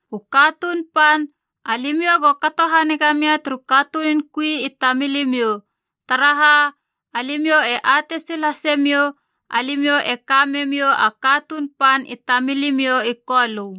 U katuun pan, alimiou go kato haniga mia turu katunun kui i tamilimiou. Taraha, alimiou e atei sil hase miou alimiou e ka memiou a katuun pan i tamilimiou i Kolö.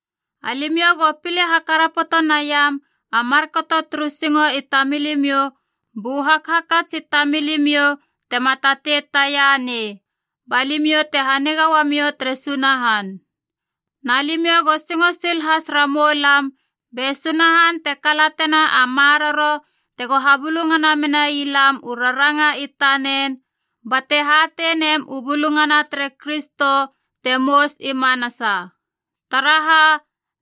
Alimiou go pile hakarapoto naiam a markato turu singo i tamilimiou bu hakhakats i tamilimiou tema tatei tianei, ba limiou te haniga uamiou tere Sunahan. Na limiou go singo sil has ramoulam be Sunahan te kalatena a maroro tego habulungana menai lam u raranga i tanen bate hatei nem u bulungana tere Kristo, te mous i manasa. Taraha,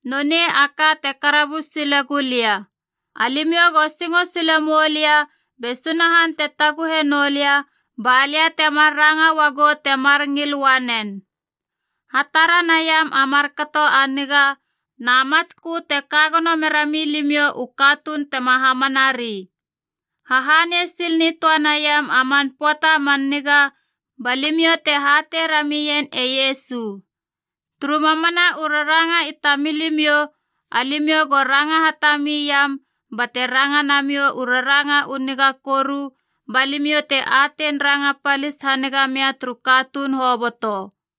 nonei a ka te karabus sile gulia. Alimiou go singo sile moulia be Sunahan te taguhe nou lia ba lia temar ranga uagu temar ngil uanen. Hatara naiam a markato a niga na matskö te ka gono mera milimiou u katuun tema hamanari. Hahanei sil nitöa neiam a man pöata a man niga ba limiou te hatei ramien e Iesu. Turu mamana u raranga i tamilimiou, alimiou go ranga hatami iam bate ranga namiou u raranga u niga koru, ba limiou te atein ranga palis haniga mia turu katuun hoboto.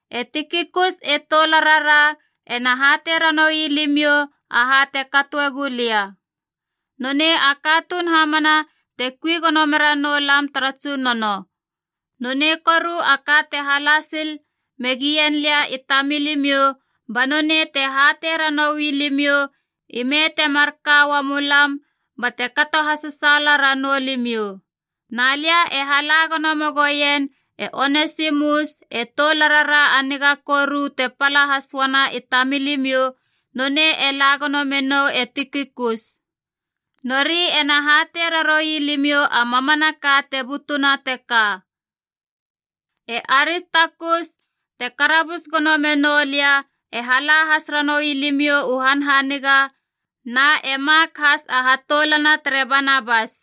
E Tikikus e toularara ena hatei ranoui limiou aha te katoe gulia. Nonei a katuun hamana te kui gono mera noulam tara Tsunono. Nonei koru a ka te hala sil megien lia i tamilimiou ba nonei te hatei ranoui limiou ime te marka uamu lam, bate kato hasasaala ranou limiou. Na lia e hala gono megoien e Onesimus e toularara a niga koru te pala has uana i tamilimiou, nonei e la gono menou e Tikikus. Nori ena hatei raroui limiou a mamanaka te butuna teka. E Aristakus, te karabus gono menou lia, e hala has ranoui limiou u hanhaniga, na e Mak has a hatoulana tere Banabas.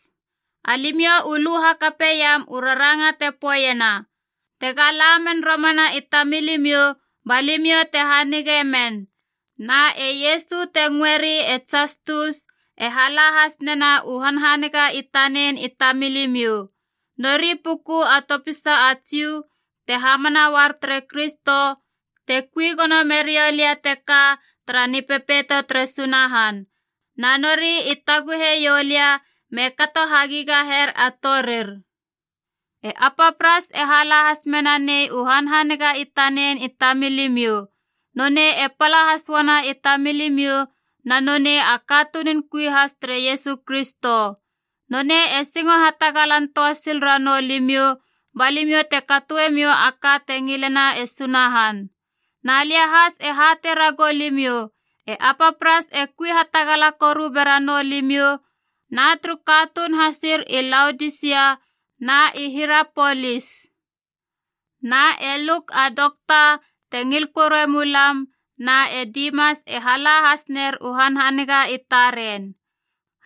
Alimiou u lu hakapeiam u raranga te poeiena, tega la men romana i tamilimiou ba limiou te hanige men. Na e Iesua te ngöeri e Jastus e hala has nena u hanhaniga i tanen i tamilimiou. Nori puku a topisa a Jiu te hamana uar tere Kristo te kui gono meriou lia teka tara Nipepeito tere Sunahan. Na nori i taguhe ioulia me kato hagigaher a torir. Epapras e hala has mena nei u hanhaniga i tanen i tamilimiou. Nonei e pala has uana i tamilimiou na nonei a katunun kui has tere Iesu Kristo. Nonei e singo hatagalan töa sil ranou limiou, ba limiou te katoe miou a ka te ngilena e Sunahan. Na lia has e hatei ragou limiou e Epapras e kui hatagala koru bera noulimiou, na turu katuun hasir i Laodisia na i Hirapolis. Na e Luk a dokta te ngil korue mulam na e Dimas e hala has ner u hanhaniga i taren.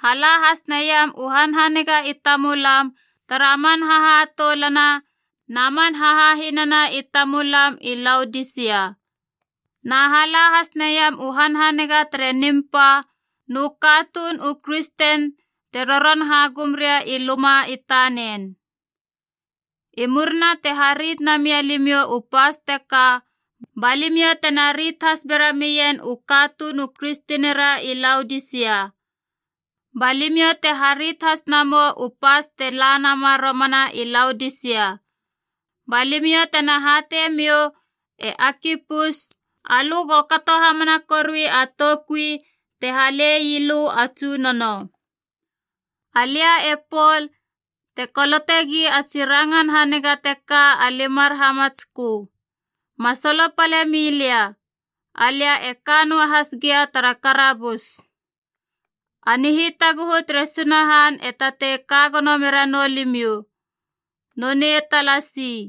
Hala has naiam u hanhaniga i tamulam tara man hahatoulana na man hahahinana i tamulam i Laodisia. Na hala has neiam u hanhaniga tere Nimpab nu katuun u kristen te roron hagum ria i luma i tanen. I murina te harit namia limiou u pas teka, ba limiou tena rit has bera mien u katuun u kristenira i Laodisia. Ba limiou te harit has namou u pas te la nama romana i Laodisia. Ba limiou tena hatei miou e Akipus, alö go kato hamana korui a toukui te halei lö a Tsunono. Alia e Pol te kolotegi a tsi rangan haniga teka a limar hamatskö. Ma solopalemi lia, alia e ka noa has gia tara karabus. A nihitaguhu tere Sunahan e tatei ka gono mera noulimiou. Nonei talasi.